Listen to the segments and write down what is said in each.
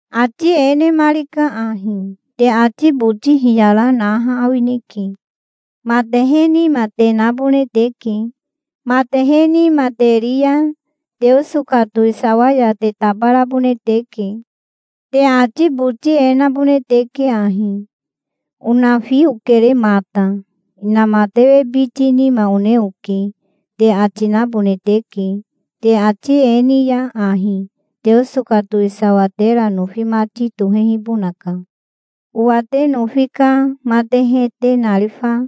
Ati e nemarika ahi: "Te ati boti hiyara naha awineke. Matehe nima te nabone teke. Matehe nima te ri ya Teoso ka towisawa ya te tabarabone teke. Te ati boti e nabone teke ahi: 'Onafi okere mata. Inamatewe biti nima one oke', te ati nabone teke. Te ati e ni ya ahi Teoso ka towisawa tera nofi mati tohehibonaka. Owa te nofi ka matehe te narifa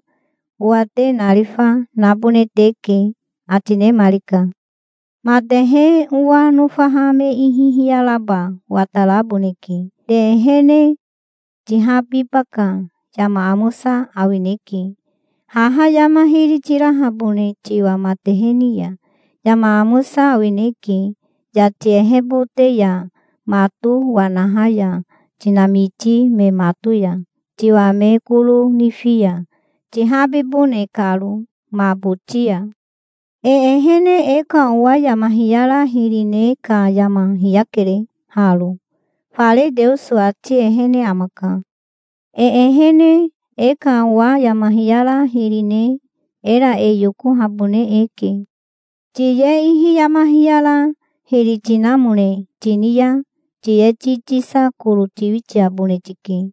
owa te narifa, nabone teke", ati nemarika. "Matehe owa nofaha me ihi hiyaraba wataraboneke te ehene. Tihabiba ka yama amosa awineke, haha yama hiri tirahabone tiwa matehe ni ya. Yama amosa awineke, yati ehebote ya mato wanaha ya tinamiti me mato ya tiwa me koro nifi ya, tihabibone karo ma boti ya. E ehene e ka owa yama hiyara hiri ne ka yama hiyakere haro. Fare Teoso ati ehene amaka. E ehene e ka owa yama hiyara hiri ne era e yokohabone eke. Tiye ihi yama hiyara hiri tinamone tini ya tiye ti tisa koro tiwitiabone tike.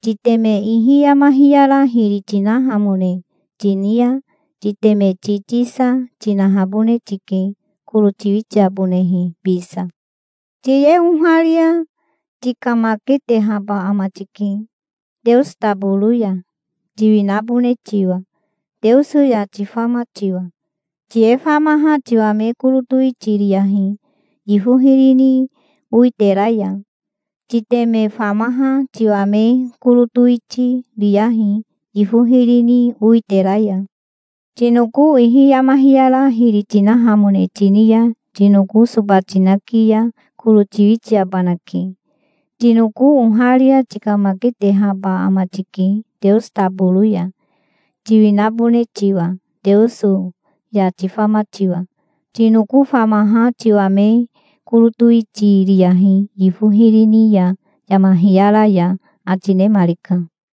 Titeme ihi yama hiyara hiri tinahamone tini ya titeme ti tisa, tinahabone tike, koro tiwitiabonehe bisa. Tiye oharia tikamaketehaba ama tike Teoso taboro ya, tiwinabone tiwa Teoso ya tifama tiwa. Tiye famaha tiwa me koro towiti riyahi yifo hiri ni owitera ya. Titeme famaha tiwa me koro towiti riyahi yifo hiri ni owitera ya. Tinoko ihi yama hiyara hiri tinahamone tini ya tinoko soba tinaki ya koro tiwitiabanake. Tinoko oharia tikamaketehaba ama tike Teoso taboro ya, tiwinabone tiwa Teoso ya tifama tiwa. Tinoko famaha tiwa me koro towiti riyahi yifo hiri ni ya yama hiyara ya", ati nemarika.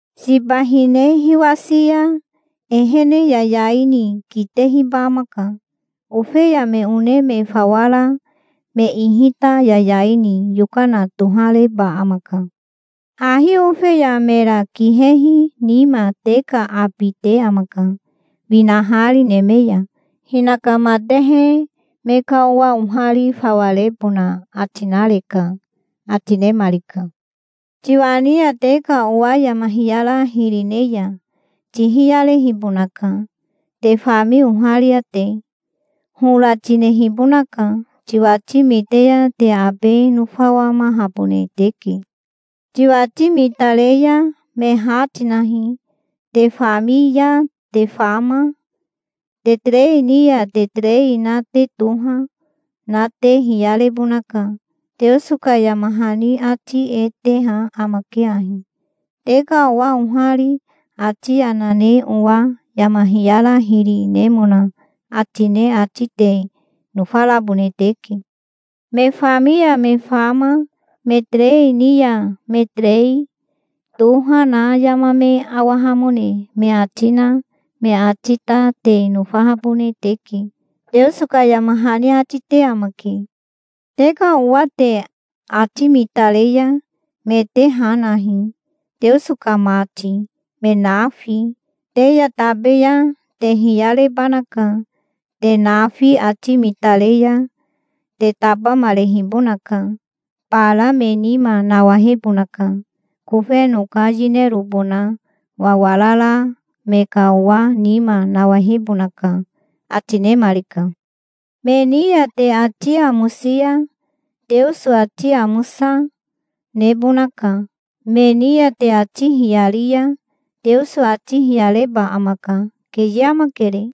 Siba hine hiwasi ya ehene yayai ni kitehiba amaka. Ofeya me one me fawa ra me ihi ta yayai ni yokana tohareba amaka. Hahi ofeya mera kihehi nima te ka abi te amaka, winahari neme ya. Hinaka matehe me ka owa ohari fawa rebona ati nareka", ati nemarika. "Tiwa ni ya te ka owa yama hiyara hiri ne ya tihiyarehibonaka, te fami oharia te. Hora tinehibonaka. Tiwati mite ya te abe nofawamahabone teke. Tiwati mitare ya me ha tinahi. Te fami ya te fama, te terei ni ya te terei na te toha, na te hiyarebonaka. Teoso ka yama hani ati e teha amake ahi: 'Te ka owa ohari ati yana ne owa yama hiyara hiri nemona ati ne ati te nofarabone teke. Me fami ya me fama me terei ni ya me terei, toha na yama me awahamone me ati na me ati ta te nofahabone teke', Teoso ka yama hani ati te amake. Te ka owa te ati mitare ya me te ha nahi, Teoso ka mati, me nafi. Te ya tabe ya te hiyarebanaka. Te nafi ati mitare ya te tabamarehibonaka. Bara me nima nawahebonaka. Kofeno ka yinerobona wawarara me ka owa nima nawahebonaka", ati nemarika. "Me ni ya te ati amosi ya Teoso ati amosa, nebonaka. Me ni ya te ati hiyari ya Teoso ati hiyareba amaka. Keye amakere.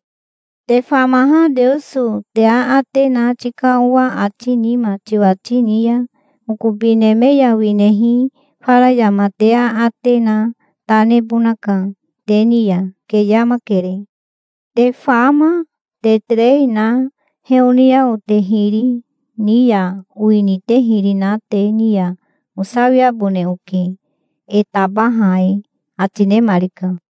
Te famaha Teoso te aate na tika owa ati nima tiwati ni ya okobi neme ya winehi fara yama te aate na ta nebonaka te ni ya. Keye amakere. Te fama, te terei na heoniao te hiri ni ya owini te hiri na te ni ya osawiabone oke e tabaha e", ati nemarika.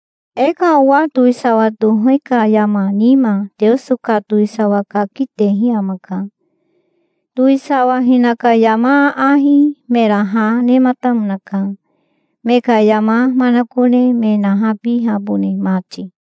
"E ka owa towisawa tohe ka yama nima Teoso ka towisawa kaki tehi amaka. Towisawa hinaka yama aahi mera ha nematamonaka, me ka yama manakone me nahabihabone mati.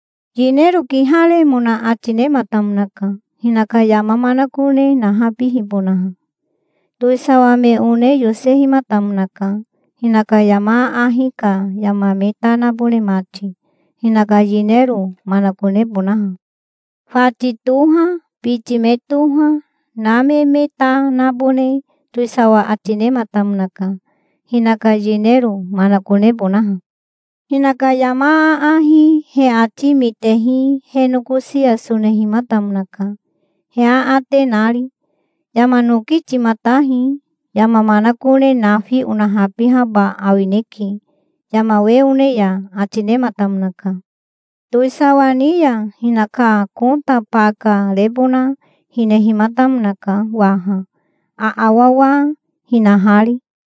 Yinero kiharemona ati nematamonaka, hinaka yama manakone nahabihibonaha. Towisawa me one yosehimatamonaka, hinaka yama aahi ka yama me ta nabone mati, hinaka yinero manakonebonaha. Fati toha, biti me toha, na me me ta nabone towisawa ati nematamonaka, hinaka yinero manakonebonaha". "Hinaka yama aahi he ati mitehi he nokosi ya sonehimatamonaka, he aate nari. 'Yama noki timatahi. Yama manakone nafi onahabihaba awineke, yama we one ya', ati nematamonaka". "Towisawa ni ya hinaka kota baka rebona hinehimatamonaka waha, aawawa hinahari".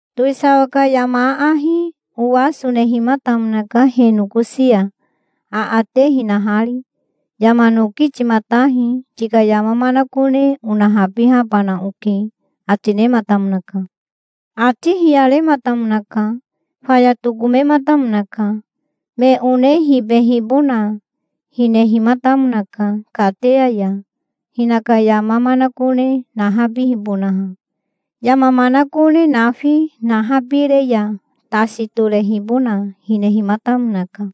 "Towisawa ka yama aahi owa sonehimatamonaka he nokosi ya aate hinahari. 'Yama noki timatahi. Tika yama manakone onahabihabana oke', ati nematamonaka". "Ati hiyarematamonaka. Faya tokomematamonaka. Me one hibehibona hinehimatamonaka kateya ya, hinaka yama manakone nahabihibonaha. Yama manakone nafi nahabire ya tasi torehibona hinehimatamonaka".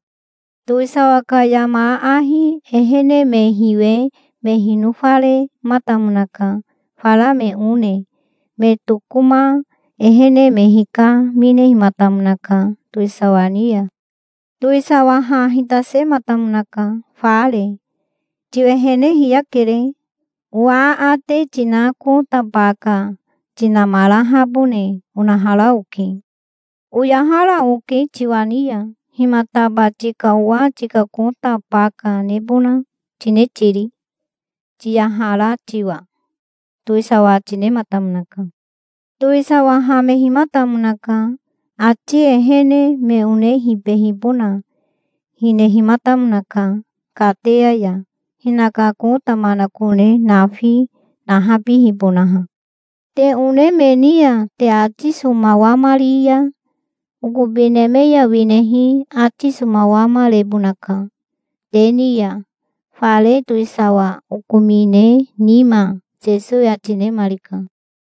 "Towisawa ka yama aahi ehene me hiwe me hinofarematamonaka fara me one. Me tokoma ehene me hikaminehimatamonaka towisawa ni ya". "Towisawa ha hitasematamonaka, fare. 'Tiwehene hiyakere. Owa aate tina kota baka tinamarahabone onahara oke. Oyahara oke tiwa ni ya. Himataba tika owa tika kota baka nebona tine tiri, tiyahara tiwa?' towisawa ati nematamonaka". "Towisawa hamehimatamonaka. Ati ehene me one hibehibona hinehimatamonaka kateya ya, hinaka kota manakone nafi nahabihibonaha". "Te one me ni ya te ati somawamari ya okobi neme ya winehi ati somawamarebonaka te ni ya fare towisawa okomine nima", Sesowi ati nemarika.